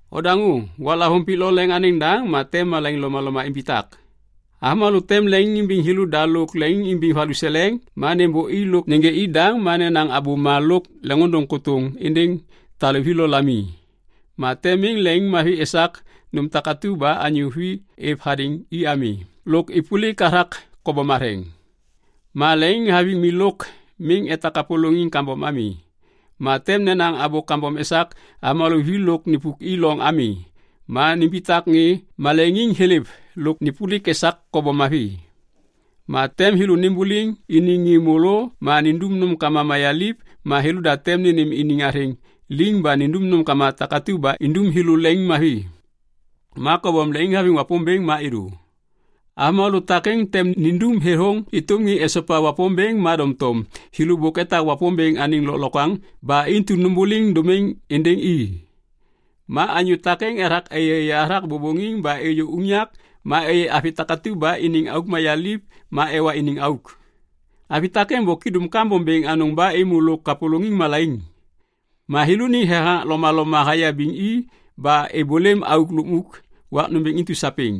Odaŋô! Waklavôŋ pik lo leŋ anêŋ daŋ ma tem malaiŋ lomaloma imbitak. Avômalô tem leŋiŋimbiŋ thêlôda lôk leŋiŋimbiŋ valuseleŋ ma nêmbôi lôk nêgê i daŋ ma nenaŋ abôma lôk leŋiŋôndôŋ kôtôŋ êndêŋ taluvi lo lami. Ma tem miŋ leŋiŋmavi esak nôm takatu ba anyô vi êv hadêŋ i ami lôk êpôlik hathak kobom matheŋ ma leŋiŋhaviŋ mi lôk miŋ etak kapôlôŋiŋ kambom ami. Ma tem nenaŋ abô kambom esak avômalô vi lôk nipuki loŋ ami ma nimbitak ŋê maleŋiŋ thêlêv lôk nêpôlik esak kobom mavi. Ma tem thêlô nimbuliŋ iniŋ ŋê môlô ma nindum nômkama mayaliv ma thêlôda tem nênêm iniŋ athêŋ liŋ ba nindum nômkama takatu ba indum thêlô leŋiŋmavi ma kobom leŋiŋhaviŋ Wapômbêŋ ma êdô. Avômalô takêŋ tem nindum thêthôŋ êtôm ŋê esopa Wapômbêŋ ma doŋtom thêlô bôk etak Wapômbêŋ anêŋ lôklokwaŋ ba intu nômbôliŋ dômiŋ êndêŋ i. Ma anyô takêŋ ethak êyêyê hathak bôbôŋiŋ ba êyô unyak ma êyê avi takatu ba iniŋ auk mayaliv ma ewa iniŋ auk. Avi takêŋ bôk idum kambom bêŋ anôŋ ba êmô lôk kapôlôŋiŋ malaiŋ. Ma thêlôniŋ thethaŋak lomaloma hayabiŋ i ba êbôlêm auk lukmuk wak nômbêŋ intu sapêŋ.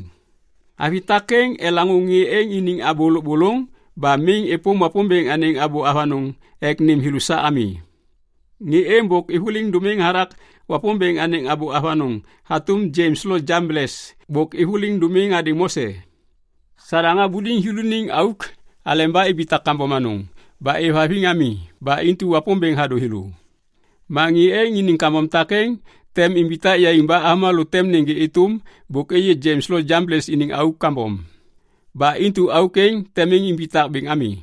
Avi takêŋ elaŋô ŋê êŋ iniŋ abô lôbôlôŋ ba miŋ êpôm Wapômbêŋ anêŋ abô avanôŋ ek nêm thêlô sa ami. Ŋê êŋ bôk êvôliŋ dômiŋ hathak Wapômbêŋ anêŋ abô avanôŋ hatôm Janes lo Jambles bôk êvôliŋ dômiŋ hadêŋ Mose. Sadaŋ habuliŋ thêlô iniŋ auk aleba ibitak kambom anôŋ ba êvhaviŋ ami ba intu Wapômbêŋ hadô thêlô. Ma ŋê êŋ iniŋ kambom takêŋ tem imbitak yaiŋ ba avômalô tem nêgê êtôm bôk êyê Janes lo Jambles iniŋ auk kambom. Ba intu auk êŋ tem miŋ imbitak bêŋ ami.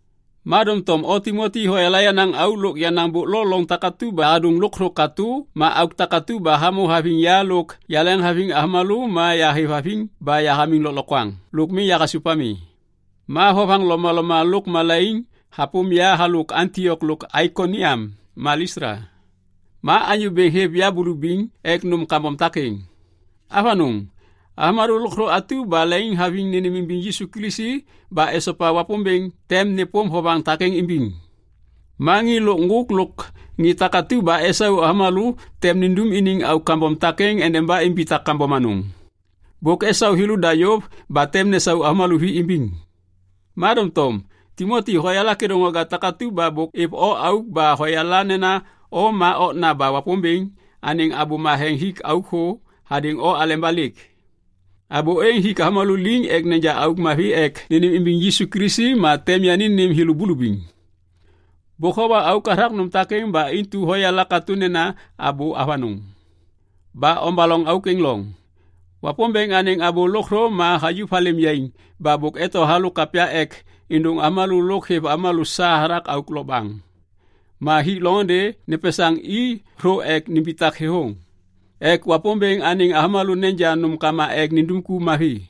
Ma doŋtom o Timoti hoyala yenaŋ auk lôk yenaŋ bôk lo loŋ takatu ba yahadôŋ lôkthô katô ma auk takatu ba hamô haviŋ ya lôk yaleŋhaviŋ avômalô ma yahêvhaviŋ ba yahamiŋ lôklokwaŋ lôk miŋ yahasôv ami. Ma vovaŋ lomaloma lôk malaiŋ hapôm ya halôk Antiok lo Aikoniam ma Listla. Ma Anyô Bêŋ hêv ya bulubiŋ ek nôm kambom takêŋ. Avanôŋ! Avômalô lôkthô atu ba leŋiŋhaviŋ nênêmimbiŋ Yisu Kilisi ba esopa Wapômbêŋ tem nêpôm vovaŋ takêŋ imbiŋ. Ma ŋê lôk ŋgôk lôk ŋê takatu ba esau avômalô tem nindum iniŋ auk kambom takêŋ endeba imbitak kambom anôŋ. Bôk esau thêlôda yôv ba tem nesau avômalô vi imbiŋ. Ma doŋtom Timoti hoyala kêdôŋwaga takatu ba bôk êv o auk ba hoyala nena o ma okna ba Wapômbêŋ anêŋ abô matheŋ hik auk thô hadêŋ o aleba lêk. Abô êŋ hik avômalô liŋ ek neja auk mavi ek nênêmimbiŋ Yisu Kilisi ma tem yani nêm thêlô bulubiŋ. Bôk howa auk hathak nôm takêŋ ba intu hoyala katô nena abô avanôŋ. Ba ombaloŋ auk êŋ loŋ. Wapômbêŋ anêŋ abô lôkthô ma hayuv halêm yaiŋ ba bôk eto halôk kapya ek êndôŋ avômalô lôk hêv avômalô sa hathak auk lokbaŋ. Ma hik loŋôndê nepesaŋ i thô ek nimbitak thêthôŋ ek Wapômbêŋ anêŋ avômalô neja nômkama ek nindum ku mavi.